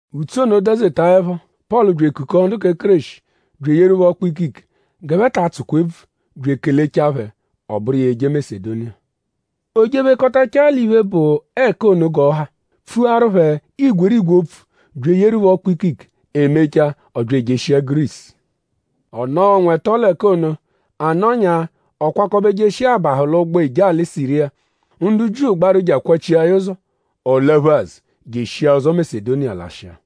Ùtsú ono dazetaẹpho; Pọlu bya ekukọo ndu kẹ Kéreshi bya eyeru phẹ ọkpu-ikike g'ẹphe ta atsụkwa ebvu bya ekelechaa phẹ; ọ bụru iya eje Masedoniya. O jephekọtachaa l'iphe, bụ ẹka ono g'ọ ha pfuaru phẹ igwerigwe opfu bya eyeru phẹ ọkpu-ikike. E mechaa; ọ bya ejeshia Gurisu. Ọ nọo ọnwa ẹto l'ẹka ono. A nọnyaa; ọ kwakọbe jeshia abahụ l'ụgbo eje alị Siriya. Ndu Jiu gbaru je akwachia ya ụzo. Ọ laphu azụ je eshia ụzo Masedoniya lashịa.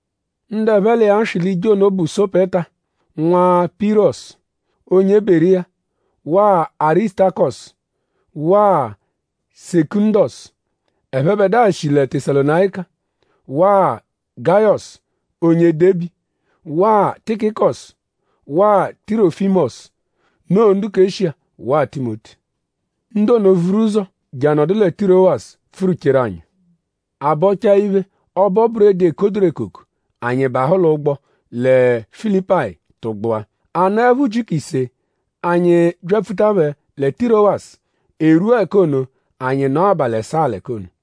Ndu ẹphe l'iya swị l'ije ono bụ Sopeta, nwa Pirọsu, onye Beriya waa Arisutakọsu waa Sekụndosu, ẹphebedua shi lẹ Tesalonayika; waa Gayọsu onye Debi; waa Tikikọsu waa Tirọfimosu; noo ndu kẹ Eshiya; waa Timoti. Ndu ono vuru ụzo je anọdu lẹ Tirowasu pfụru-cheru anyi. A -bọchaa iphe “Ọbo-buredi, ekoduru ekoko”; anyi bahụ l'ụgbo lẹ Filipayi tụgbua. A nọepho ujiku ise; anyi byapfuta phẹ lẹ Tirowasu. E rwua ẹka ono; anyi nọo abalị ẹsaa l'ẹka ono.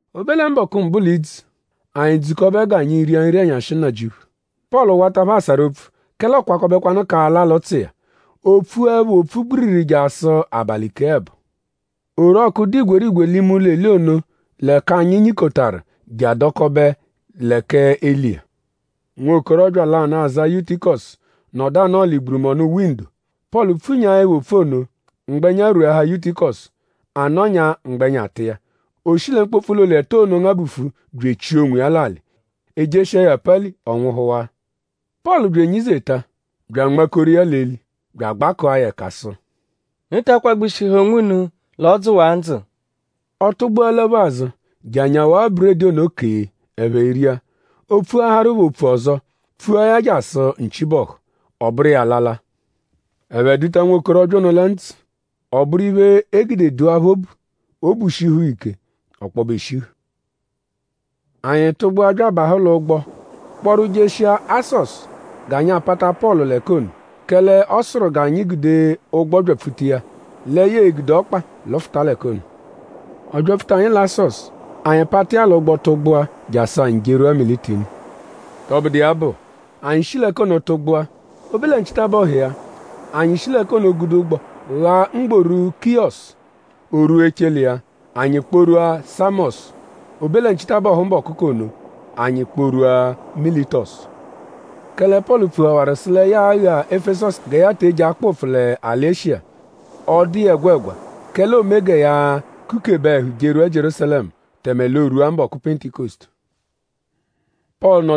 O be lẹ mbọku mbụ l'idzu; anyi dzukọbe g'anyi ria Nri-ẹnyashi-Nnajịuphu. Pọlu wata phẹ asarụ opfu; kẹle ọokwakobekwanu k'ala l'ụtsu iya. O pfuẹpho opfu gbiriri jasụ abalị kee ẹbo. Orọku dụ igwerigwe l'ime ụlo-eli ono l'ẹka anyi nyikotaru je adọkobe lẹ k'eli iya. Nwokorọbya lanụ, aza Yutikọsu nọdu anọo l'igburọnu windo. Pọlu pfunyaẹpho opfu ono; mgbẹnya rweahaa Yutikọsu. A nọnyaa mgbẹnya tụ iya. O shi lẹ mkpopfu ụlo-eli ẹto ono ngabufu bya echia onwiya l'alị. E jeshia ya apali; ọ nwụhuwaa. Pọlu bya enyizeta bya anmakoru iya l'eli bya agbakụa ya ẹka sụ: “Unu ta akwagbushihẹ onwunu l'ọ dzụwaa ndzụ!” Ọ tụgbua laphu azụ je anyawaa buredi ono kee; ẹphe ria. O pfuaharu phẹ opfu ọzo; pfua ya jasụ nchi bọhu. Ọ bụru iya alala. Ẹphe duta nwokorọbya ono lẹ ndzụ. Ọ bụru iphe, e gude dụa phẹ obu; obu shihu phẹ ike ọkpobe eshihu. Anyi tụgbua bya abahụ l'ụgbo kpọru jeshia Asọsu g'anyi apata Pọlu l'ẹka ono; kẹle ọ sụru g'anyi gude ụgbo byapfuta iya lẹ ya e-gude ọkpa lụfuta l'ẹka ono. Ọ byapfuta anyi lẹ Asọsu; anyi pata iya l'ụgbo tụgbua jasụ anyi jerwua Mitilini. Tọbudu iya bụ; anyi shi l'ẹka ono tụgbua. O be lẹ nchitabọhu iya; anyi shi l'ẹka ono gude ụgbo ghaa mgboru Kiyọsu. O rwua echele iya; anyi kpọ-rwua Samọsu. O be lẹ nchitabọhu mbọku k'ono; anyi kpọ-rwua Militọsu; kẹle Pọlu pfuhawaru sụ lẹ ya a-gha Efesọsu aghagha gẹ ya te eje akpọ ụpfu l'alị Eshiya. Ọ dụ iya ẹgwegwa; kẹle oome gẹ ya kukebe ẹhu jerwua Jierúsalẹmu; tẹme l'oorwua mbọku Pentikọsutu. Pọlu asụ: “Nọkwa-ẹhu mma”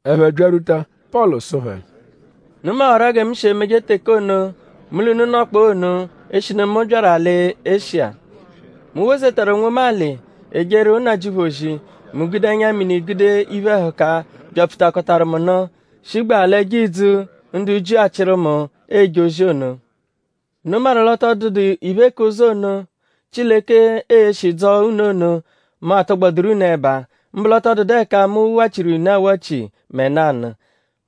Ẹphe byarwuta Pọlu sụ phẹ: “Unu mawaru-a gẹ mu shi emeje teke ono, mu l'unu nọkpoo ono eshinu mu byaru alị Eshiya. Mu wozetaru onwomu alị ejeru Nnajịuphu ozi; mu gude ẹnya-mini gude iphe-ẹhuka, byapfutakọtaru mu nụ, shigbaa l'ẹjo idzu, ndu Jiu achịru mu eje ozi ono. Unu maru l'ọ tọ dụdu iphe k'ụzo ono, Chileke e-shi dzọo unu ono, mu atọgboduru unu ẹba; mbụ l'ọ tọ dụdu ẹka mu wachiru iya unu awachi mẹ nanụ.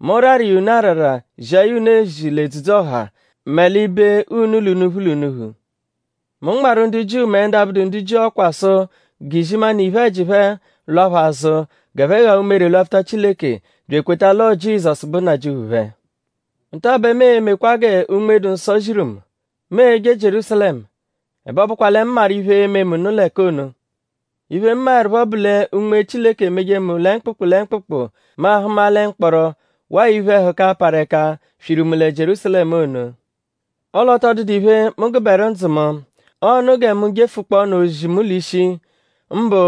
Mu rarụ iya unu arara zia ya unu l'edzudzu-ọha mẹ l'ibe unu l'unuphu l'unuphu. Mu nmarụ ndu Jiu mẹ ndu abụdu ndu Jiu ọkwa sụ g'izimanụ iphe-ẹji phẹ lwa phẹ azụ g'ẹphe gha umere lwapfuta Chileke bya ekweta l'ọo Jizọsu bụ Nnajịuphu phẹ. Nta-a bẹ mu e-mekwa gẹ Unme-dụ-Nsọ ziru mu. Mu e-je Jierúsalẹmu; ẹbe ọ bụkwa lẹ mu maru iphe, ee-me mu nụ l'ẹka ono. Iphe, mu maẹrupho bụ lẹ Unme Chileke emeje mu lẹ mkpụkpu lẹ mkpụkpu mu ahụma lẹ mkpọro waa iphe-ẹhuka, parụ ẹka swiru mu lẹ Jierúsalẹmu ono. Ọle ọ tọ dụdu iphe, mu gụberu ndzụ mu. Ọo 'nụ gẹ mu jefukpọonu ozi mu l'ishi; mbụ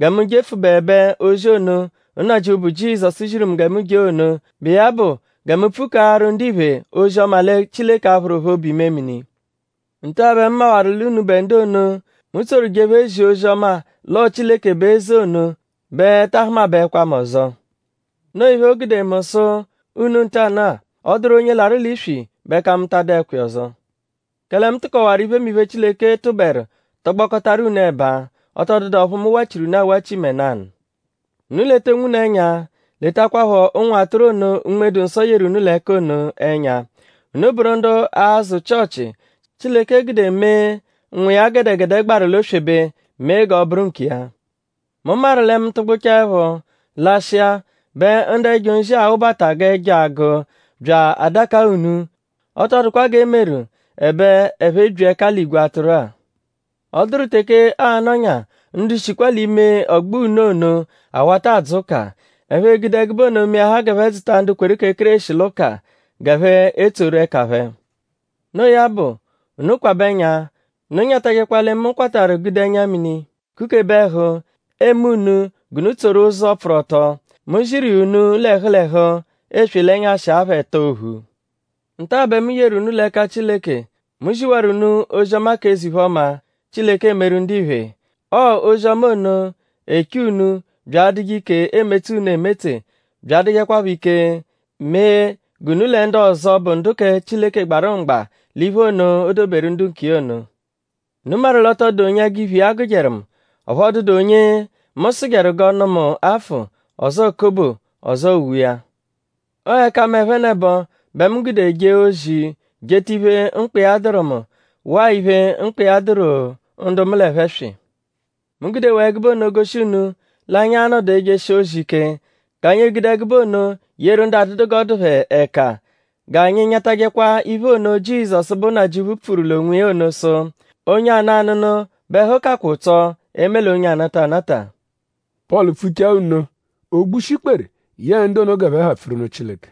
gẹ mu jefụbebe ozi ono, Nnajịuphu bụ Jizọsu ziru mu gẹ mu jee ono, bụ iya bụ gẹ mu pfukaaru ndiphe k'ozi-ọma lẹ Chileke a-phụru phẹ obu-imemini. “Nta bẹ mu mawaru l'unubẹ ndu ono, mu tsoru jephee zia ozi-ọma l'ọo Chileke bụ eze ono bẹ taa hụmabaekwa mu ọzo. Noo iphe, mu gude sụ unu ntanụ-a; ọ -dụru onye larụ l'iswi bẹ ẹka mu ta adụekwa iya ọzo. Kẹle mu tụkowaru iphemiphe, Chileke tụberu tọgbokotaru unu ẹba. Ọ tọ dụdu ọphu mu wachiru unu awachi mẹ nanụ. Unu leta onwunu ẹnya letakwaphọ ụnwu atụru ono, Unme-dụ-Nsọ yeru unu l'ẹka ono ẹnya. Unu bụru ndu azụ Chịochi, Chileke gude mee, Nwa iya gẹdegede gbaru l'oswebe; mee g'ọ bụru nkiya. Mu maru lẹ mu -tụgbuchaepho lashịa bẹ ndu ẹjo nzi a-wụbata g'ẹjo agụ bya adakaa unu. Ọ tọ dụkwa g'e meru; ẹbe ẹphe ebyi ẹka l'igwe atụru-a. Ọ dụru teke aa-nọnya ndu shikwaa l'ime ọgbo unu ono awata adzụ ụka. Ẹphe egude ẹgube ono meahaa g'ẹphe dzụta ndu kweru kẹ Kéreshi l'ụka g'ẹphe etsoru ẹka phẹ. Noo ya bụ; unu kwabẹ ẹnya. Unu nyatajẹkwa lẹ mu kwatarụ gude ẹnya-mini kukebe ẹhu eme unu g'unu tsoru ụzo, pfụru ọto. Mu ziru iya unu l'ẹhu l'ẹhu; eswe l'ẹnyashi apha ẹto ophu. “Nta bẹ mu yeru unu l'ẹka Chileke. Mu ziwaru unu ozi-ọma k'eze-iphe-ọma, Chileke emeru ndiphe. Ọo ozi-ọma ono eche unu bya adụje ike emetse unu emetse bya adụjekwapho ike mee g'unu lẹ ndu ọzo, bụ ndu kẹ Chileke gbarụ mgba l'iphe ono, o doberu ndu nkiya ono. Unu maru l'ọ tọ dụdu onye ẹgu iphe iya gụjeru mu. Ọphu ọ dụdu onye mu sụjeru g'ọ nụ mu afụ; ọzoo kobo; ọzoo uwe iya. Ọo ẹka mu-a ẹphenebo bẹ mu gude jee ozi jeta iphe, mkpa iya dụru mu; waa iphe, mkpa iya dụru ndu mu l'ẹphe swị. Mu gudewaa ẹgube ono goshi unu l'anyi a-nọdu ejeshije ozi ike g'anyi egude ẹgube ono yeru ndu adụdu g'ọ dụ phẹ ẹka. G'anyi nyatajẹkwa iphe ono, Jizọsu, bụ Nnajịuphu pfuru l'onwiya ono sụ: ‘Onye anụ anụnu bẹ ẹhu kakwa ụtso eme l'onye anata anata.’” Pọlu pfuchaa nno; o gbushi ikpere yẹe ndu ono g'ẹphe ha pfuru nụ Chileke.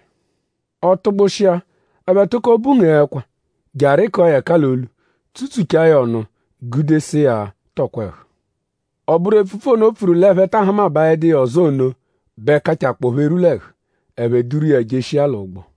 Ọ tụgbushia; ẹphe tụko bungee ẹkwa je arịkua ya ẹka l'olu; tsutsuchaa ya ọnu gude sụ iya tọkwa ẹhu. Ọ bụru epfupfu ono, o pfuru l'ẹphe taa hụmabaedu iya ọzo ono bẹ kachakpọo phẹ erwu l'ẹhu. Ẹphe duru iya jeshia l'ụgbo.